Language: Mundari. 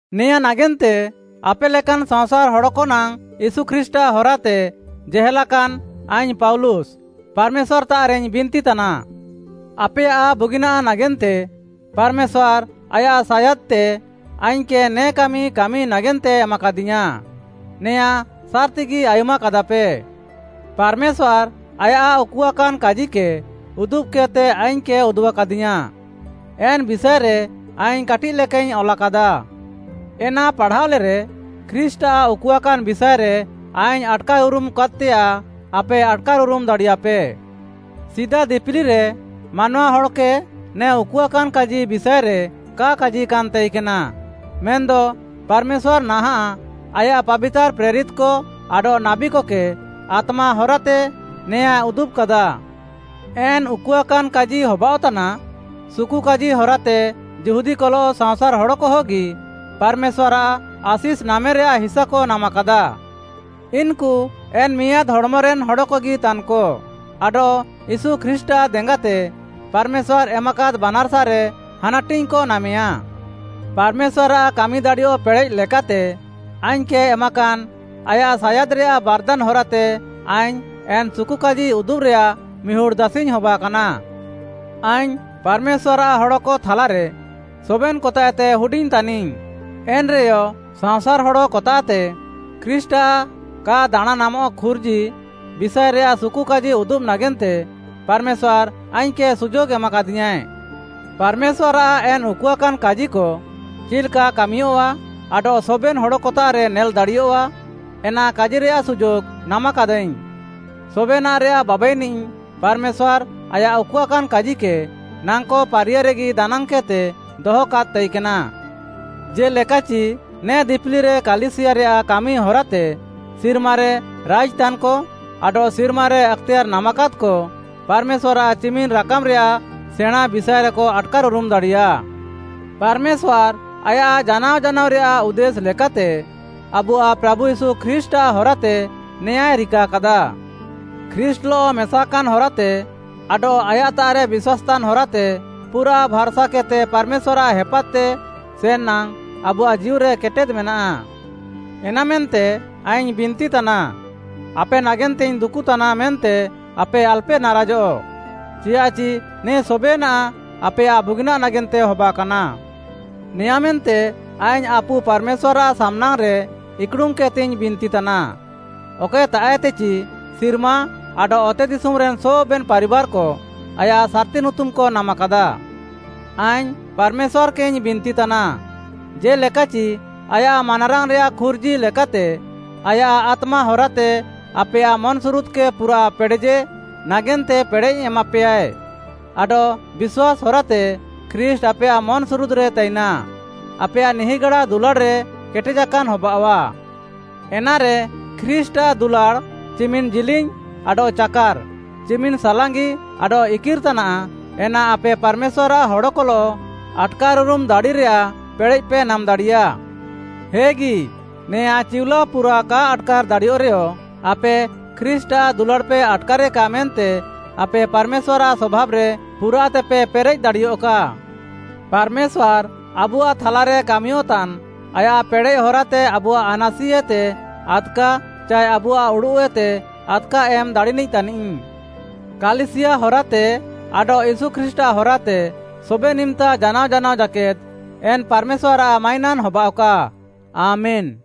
ନେଆଁଁ ନାଗେନ୍ତେ ଆପେ ଲେକାନ୍‌ ସାଅଁସାର୍‌ ହଡ଼କ ନାଙ୍ଗ୍‌ ୟୀଶୁ ଖ୍ରୀଷ୍ଟ୍‌ଆଃ ହରାତେ ଜେହେଲାକାନ୍‌ ଆଇଙ୍ଗ୍‌ ପାଉଲୁସ୍‌, ପାର୍‌ମେଶ୍ୱାର୍‌ତାଃରେଇଙ୍ଗ୍‌ ବିନ୍ତିତାନା। ଆପେୟାଃ ବୁଗିନାଃ ନାଗେନ୍ତେ ପାର୍‌ମେଶ୍ୱାର୍‌ ଆୟାଃ ସାୟାଦ୍‌ତେ ଆଇଙ୍ଗ୍‌କେ ନେ କାମି କାମି ନାଗେନ୍ତେ ଏମାକାଦିୟାଁ, ନେଆଁଁ ସାର୍‌ତିଗି ଆୟୁମ୍‌କାଦାପେ। ପାର୍‌ମେଶ୍ୱାର୍‌ ଆୟାଃ ଉକୁଆକାନ୍‌ କାଜିକେ ଉଦୁବ୍‌କେଦ୍‌ତେ ଆଇଙ୍ଗ୍‌କେ ଉଦୁବ୍‌କାଦିୟାଁ, ଏନ୍‌ ବିଷାଏରେ ଆଇଙ୍ଗ୍‌ କାଟିଃ ଲେକାଇଙ୍ଗ୍‌ ଅଲାକାଦା। ଏନା ପାଢ଼ାଅଲେରେ, ଖ୍ରୀଷ୍ଟ୍‌ଆଃ ଉକୁଆକାନ୍‌ ବିଷାଏରେ ଆଇଙ୍ଗ୍‌ ଆଟ୍‌କାର୍‌ ଉରୁମ୍‌କାଦ୍‌ତେୟାଃ, ଆପେ ଆଟ୍‌କାର୍‌ ଉରୁମ୍‌ ଦାଡ଼ିୟାପେ। ସିଦା ଦିପିଲିରେ ମାନୱା ହଡ଼କେ ନେ ଉକୁଆକାନ୍‌ କାଜି ବିଷାଏରେ କା କାଜିକାନ୍‌ ତାଇକେନା। ମେନ୍‌ଦ ପାର୍‌ମେଶ୍ୱାର୍‌ ନାହାଁଃ ଆୟାଃ ପାବିତାର୍‌ ପ୍ରେରିତ୍‌କ ଆଡଃ ନାବୀକକେ ଆତ୍ମା ହରାତେ ନେଆଁଁଏ ଉଦୁବ୍‌କାଦା। ଏନ୍‌ ଉକୁଆକାନ୍‌ କାଜି ହବାଃଅତାନା, ସୁକୁକାଜି ହରାତେ ଯିହୁଦୀକଲଃ ସାଅଁସାର୍‌ ହଡ଼କହଗି ପାର୍‌ମେଶ୍ୱାର୍‌ଆଃ ଆଶିଷ୍‌ ନାମେରେୟାଃ ହିସାକ ନାମାକାଦା। ଇନ୍‌କୁ ଏନ୍‌ ମିଆଁଦ୍‌ ହଡ଼୍‌ମରେନ୍‌ ହଡ଼କଗି ତାନ୍‌କ ଆଡଃ ୟୀଶୁ ଖ୍ରୀଷ୍ଟ୍‌ଆଃ ଦେଙ୍ଗାତେ ପାର୍‌ମେଶ୍ୱାର୍‌ ଏମାକାଦ୍‌ ବାନାର୍‌ସାରେ ହାନାଟିଙ୍ଗ୍‌କ ନାମେୟାଁ। ପାର୍‌ମେଶ୍ୱାର୍‌ଆଃ କାମିଦାଡ଼ିୟଃ ପେଡ଼େଃ ଲେକାତେ ଆଇଙ୍ଗ୍‌କେ ଏମାକାନ୍‌ ଆୟାଃ ସାୟାଦ୍‌ରେୟାଃ ବାର୍‌ଦାନ୍‌ ହରାତେ ଆଇଙ୍ଗ୍‌ ଏନ୍‌ ସୁକୁକାଜି ଉଦୁବ୍‌ରେୟାଃ ମିହୁଡ଼୍‌ ଦାସିଇଙ୍ଗ୍‌ ହବାକାନା। ଆଇଙ୍ଗ୍‌ ପାର୍‌ମେଶ୍ୱାର୍‌ଆଃ ହଡ଼କ ଥାଲାରେ ସବେନ୍‌କତାଃଏତେ ହୁଡିଙ୍ଗ୍‌ ତାନିଙ୍ଗ୍‌, ଏନ୍‌ରେୟ, ସାଅଁସାର୍‌ ହଡ଼କତାଃତେ ଖ୍ରୀଷ୍ଟ୍‌ଆଃ କା ଦାଣାଁଁନାମଃ ଖୁର୍ଜି ବିଷାଏରେୟାଃ ସୁକୁକାଜି ଉଦୁବ୍‌ ନାଗେନ୍ତେ ପାର୍‌ମେଶ୍ୱାର୍‌ ଆଇଙ୍ଗ୍‌କେ ସୁଯୋଗ୍‌ ଏମାକାଦିୟାଁଏ। ପାର୍‌ମେଶ୍ୱାର୍‌ଆଃ ଏନ୍‌ ଉକୁଆକାନ୍‌ କାଜିକ ଚିଲ୍‌କା କାମିୟଃଆ ଆଡଃ ସବେନ୍‌ ହଡ଼କତାଃରେ ନେଲ୍‌ଦାଡ଼ିୟଃଆ ଏନା କାଜିରେୟାଃ ସୁଯୋଗ୍‌ ନାମ୍‌କାଦାଇଙ୍ଗ୍‌। ସବେନାଃରେୟାଃ ବାବାଇନିଃ ପାର୍‌ମେଶ୍ୱାର୍‌ ଆୟାଃ ଉକୁଆକାନ୍‌ କାଜିକେ ନାଙ୍କ ପାରିୟାରେଗି ଦାନାଙ୍ଗ୍‌କେଦ୍‌ତେ ଦହକାଦ୍‌ ତାଇକେନା। ଜେ'ଲେକାଚି ନେ ଦିପିଲିରେ କାଲିସିୟାରେୟାଃ କାମି ହରାତେ ସିର୍ମାରେ ରାଇଜ୍‌ତାନ୍‌କ ଆଡଃ ସିର୍ମାରେ ଆକ୍‌ତେୟାର୍‌ ନାମାକାଦ୍‌କ, ପାର୍‌ମେଶ୍ୱାର୍‌ଆଃ ଚିମିନ୍‌ ରାକାମ୍‌ରେୟାଃ ସେଣାଁଁ ବିଷାଏରେକ ଆଟ୍‌କାର୍‌ଉରୁମ୍‌ ଦାଡ଼ିୟା। ପାର୍‌ମେଶ୍ୱାର୍‌ ଆୟାଃ ଜାନାଅ ଜାନାଅରେୟାଃ ଉଦ୍ଦେଶ୍‌ ଲେକାତେ ଆବୁଆଃ ପ୍ରାଭୁ ୟୀଶୁ ଖ୍ରୀଷ୍ଟ୍‌ଆଃ ହରାତେ ନେଆଁଁଏ ରିକାକାଦା। ଖ୍ରୀଷ୍ଟ୍‌ଲଃ ମେସାକାନ୍‌ ହରାତେ ଆଡଃ ଆୟାଃତାଃରେ ବିଶ୍ୱାସ୍‌ତାନ୍‌ ହରାତେ ପୁରାଃ ଭାର୍‌ସାକେଦ୍‌ତେ ପାର୍‌ମେଶ୍ୱାର୍‌ଆଃ ହେପାଦ୍‌ତେ ସେନ୍‌ ନାଙ୍ଗ୍‌ ଆବୁଆଃ ଜୀଉରେ କେଟେଦ୍‌ ମେନାଃ। ଏନାମେନ୍ତେ ଆଇଙ୍ଗ୍‌ ବିନ୍ତିତାନା, ଆପେ ନାଗେନ୍ତେଇଙ୍ଗ୍‌ ଦୁକୁଃତାନା ମେନ୍ତେ ଆପେ ଆଲ୍‌ପେ ନାରାଜଃ, ଚିୟାଃଚି ନେ ସବେନାଃ ଆପେୟାଃ ବୁଗିନାଃ ନାଗେନ୍ତେ ହବାକାନା। ନେଆଁଁମେନ୍ତେ ଆଇଙ୍ଗ୍‌ ଆପୁ ପାର୍‌ମେଶ୍ୱାର୍‌ଆଃ ସାମ୍‌ନାଙ୍ଗ୍‌ରେ ଇକ୍‌ଡ଼ୁମ୍‌କେଦ୍‌ତେଇଙ୍ଗ୍‌ ବିନ୍ତି ତାନା, ଅକଏତାଃଏତେଚି ସିର୍ମା ଆଡଃ ଅତେଦିଶୁମ୍‌ରେନ୍‌ ସବେନ୍‌ ପାରିବାର୍‌କ ଆୟାଃ ସାର୍‌ତି ନୁତୁମ୍‌କ ନାମାକାଦା। ଆଇଙ୍ଗ୍‌ ପାର୍‌ମେଶ୍ୱାର୍‌କେଇଙ୍ଗ୍‌ ବିନ୍ତିତାନା, ଜେ'ଲେକାଚି ଆୟାଃ ମାନାରାଙ୍ଗ୍‌ରେୟାଃ ଖୁର୍ଜି ଲେକାତେ ଆୟାଃ ଆତ୍ମା ହରାତେ ଆପେୟାଃ ମନ୍‌ସୁରୁଦ୍‌କେ ପୁରାଃ ପେଡ଼େଜେ ନାଗେନ୍ତେ ପେଡ଼େଃ ଏମାପେୟାଏ, ଆଡଃ ବିଶ୍ୱାସ୍‌ ହରାତେ ଖ୍ରୀଷ୍ଟ୍‌ ଆପେୟାଃ ମନ୍‌ସୁରୁଦ୍‌ରେ ତାଇନା। ଆପେୟାଃ ନିହିଁଗାଡା ଦୁଲାଡ଼୍‌ରେ କେଟେଜାକାନ୍‌ ହବାଅଃଆ। ଏନାରେ ଖ୍ରୀଷ୍ଟ୍‌ଆଃ ଦୁଲାଡ଼୍‌ ଚିମିନ୍‌ ଜିଲିଙ୍ଗ୍‌ ଆଡଃ ଚାକାର୍‌, ଚିମିନ୍‌ ସାଲାଙ୍ଗି ଆଡଃ ଇକିର୍‌ ତାନାଃ, ଏନା ଆପେ ପାର୍‌ମେଶ୍ୱାର୍‌ଆଃ ହଡ଼କଲଃ ଆଟ୍‌କାର୍‌ଉରମ୍‌ ଦାଡ଼ିରେୟାଃ ପେଡ଼େଃପେ ନାମ୍‌ ଦାଡ଼ିୟା। ହେଗି, ନେଆଁଁ ଚିଉଲାଅ ପୁରା କା ଆଟ୍‌କାର୍‌ ଦାଡ଼ିୟଃରେୟ, ଆପେ ଖ୍ରୀଷ୍ଟ୍‌ଆଃ ଦୁଲାଡ଼୍‌ପେ ଆଟ୍‌କାରେକା ମେନ୍ତେ ଆପେ ପାର୍‌ମେଶ୍ୱାର୍‌ଆଃ ସଭାବ୍‌ରେ ପୁରାଃତେପେ ପେରେଃ ଦାଡ଼ିୟଃକା। ପାର୍‌ମେଶ୍ୱାର୍‌ ଆବୁଆଃ ଥାଲାରେ କାମିୟଃତାନ୍‌ ଆୟାଃ ପେଡ଼େଃ ହରାତେ ଆବୁଆଃ ଆନାସିଏତେ ଆଦ୍‌କା ଚାଏ ଆବୁଆଃ ଉଡ଼ୁଃଏତେ ଆଦ୍‌କା ଏମ୍‌ ଦାଡ଼ିନିଃ ତାନିଃ। କାଲିସିୟା ହରାତେ ଆଡଃ ୟୀଶୁ ଖ୍ରୀଷ୍ଟ୍‌ଆଃ ହରାତେ ସବେନ୍‌ ଇମ୍‌ତା ଜାନାଅ ଜାନାଅ ଜାକେଦ୍‌ ଏନ୍‌ ପାର୍‌ମେଶ୍ୱାର୍‌ଆଃ ମାଇନାନ୍‌ ହବାଅଃକା! ଆମେନ୍‌।